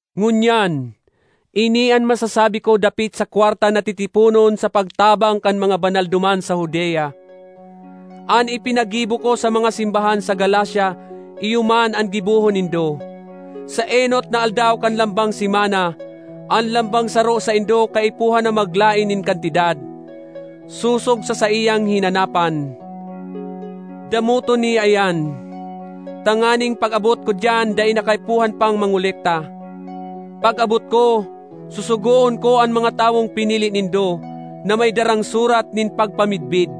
Ngunyan, ini an masasabi ko dapit sa kwarta na titiponon sa pagtabang kan mga banal duman sa Judea: an ipinagibo ko sa mga simbahan sa Galacia iyo man an gibohon nindo. Sa enot na aldaw kan lambang semana, an lambang saro saindo kaipuhan na maglaen nin kantidad, sosog sa saiyang hinanapan; damoton niya iyan, tanganing pag-abot ko diyan dai na kaipuhan pang mangolekta. Pag-abot ko, susugoon ko an mga tawong pinili nindo, na may darang surat nin pagpamidbid,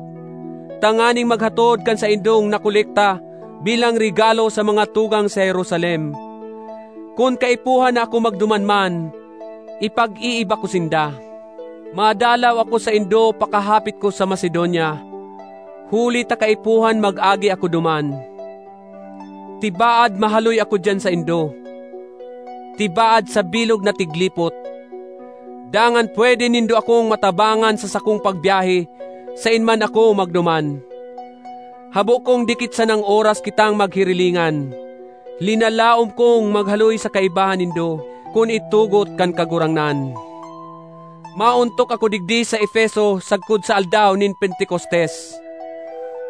tanganing maghatod kan saindong nakolekta bilang regalo sa mga tugang sa Jerusalem. Kun kaipuhan na ako magduman man, ipag-iiba ko sinda. Madalaw ako saindo pakahapit ko sa Macedonia—huli ta kaipuhan mag-agi ako duman. Tibaad mahaloy ako diyan saindo, tibaad sa bilog na tiglipot. Dangan pwede nindo akong matabangan sa sakong pagbyahe, saen man ako magduman. Habo kong dikit sanang oras kitang maghirilingan; linalaom kong maghaloy sa kaibahan nindo, kun itugot kan Kagurangnan. Maontok ako digdi sa Efeso sagkod sa aldaw nin Pentecostes.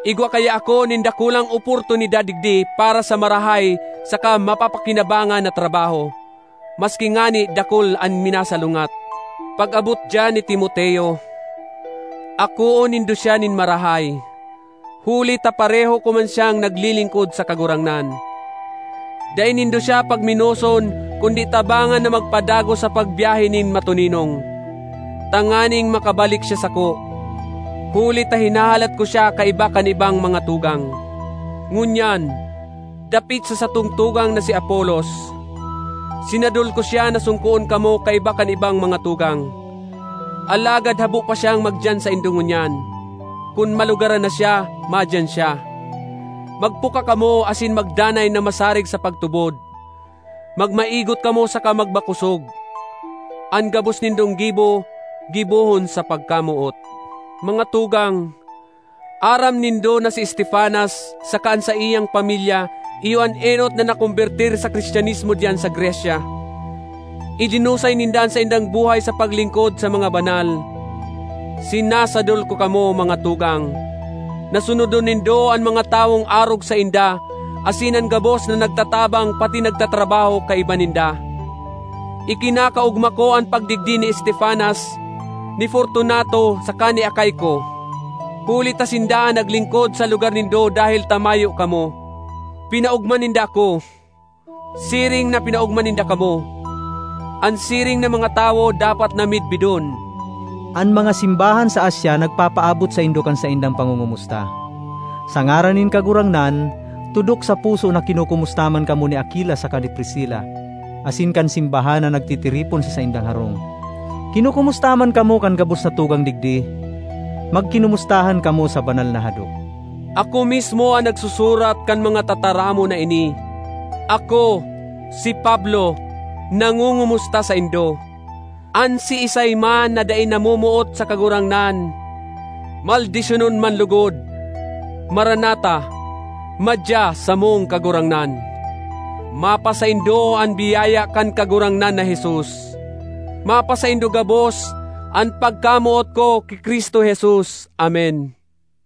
Igwa kaya ako nin dakulang oportunidad digdi para sa marahay saka mapapakinabangan na trabaho, maski ngani dakul an minasalungat. Pag-abot diyan ni Timoteo, akoon nindo siya nin marahay, huli ta pareho ko man siyang naglilingkod sa Kagurangnan. Dai nindo siya pagmenoson kundi tabangan na magpadagos sa pagbyahe nin matoninong, tanganing makabalik siya sako, huli ta hinahalat ko siya kaiba kan ibang mga tugang. Ngunyan, dapit sa satong tugang na si Apolos: sinadol ko siya na songkoon kamo kaiba kan ibang mga tugang, alagad habo pa siyang magdiyan saindo ngunyan. Kun malugaran na siya, madiyan siya. Magpuka kamo asin magdanay na masarig sa pagtubod; magmaigot kamo saka magmakosog. An gabos nindong gibo, gibohon sa pagkamoot. Mga tugang, aram nindo na si Estefanas saka an saiyang pamilya iyo an enot na nakombertir sa Cristianismo diyan sa Grecia. Idinusay ninda an saindang buhay sa paglingkod sa mga banal. Sinasadol ko kamo, mga tugang, na sunodon nindo an mga tawong arog sainda asin an gabos na nagtatabang patin nagtatrabaho kaiba ninda. Ikinakaogma ko an pagdigdi ni Estefanas, ni Fortunato saka ni Acaico, huli ta sinda an naglingkod sa lugar nindo dahel ta mayo kamo; pinaogma ninda ako, siring na pinaogma ninda kamo. An siring na mga tawo dapat na midbidon. An mga simbahan sa Asia nagpapaabot saindo kan saindang pangongomusta. Sa ngaran nin Kagurangnan, tudok sa puso na kinokomusta man kamo ni Aquila saka ni Priscila asin kan simbahan na nagtitiripon sa saindang harong. Kinokomusta man kamo kan gabos na tugang digdi. Magkinomustahan kamo sa banal na hadok. Ako mismo an nagsusurat kan mga tataramon na ini: Ako, si Pablo, nangongomusta saindo. An siisay man na dai namomoot sa Kagurangnan, maldisyonon man logod! Maranatha- madya, samong Kagurangnan! Mapasaindo an biyaya kan Kagurangnan na Jesus. Mapasaindo gabos an pagkamoot ko ki Cristo Jesus. Amen.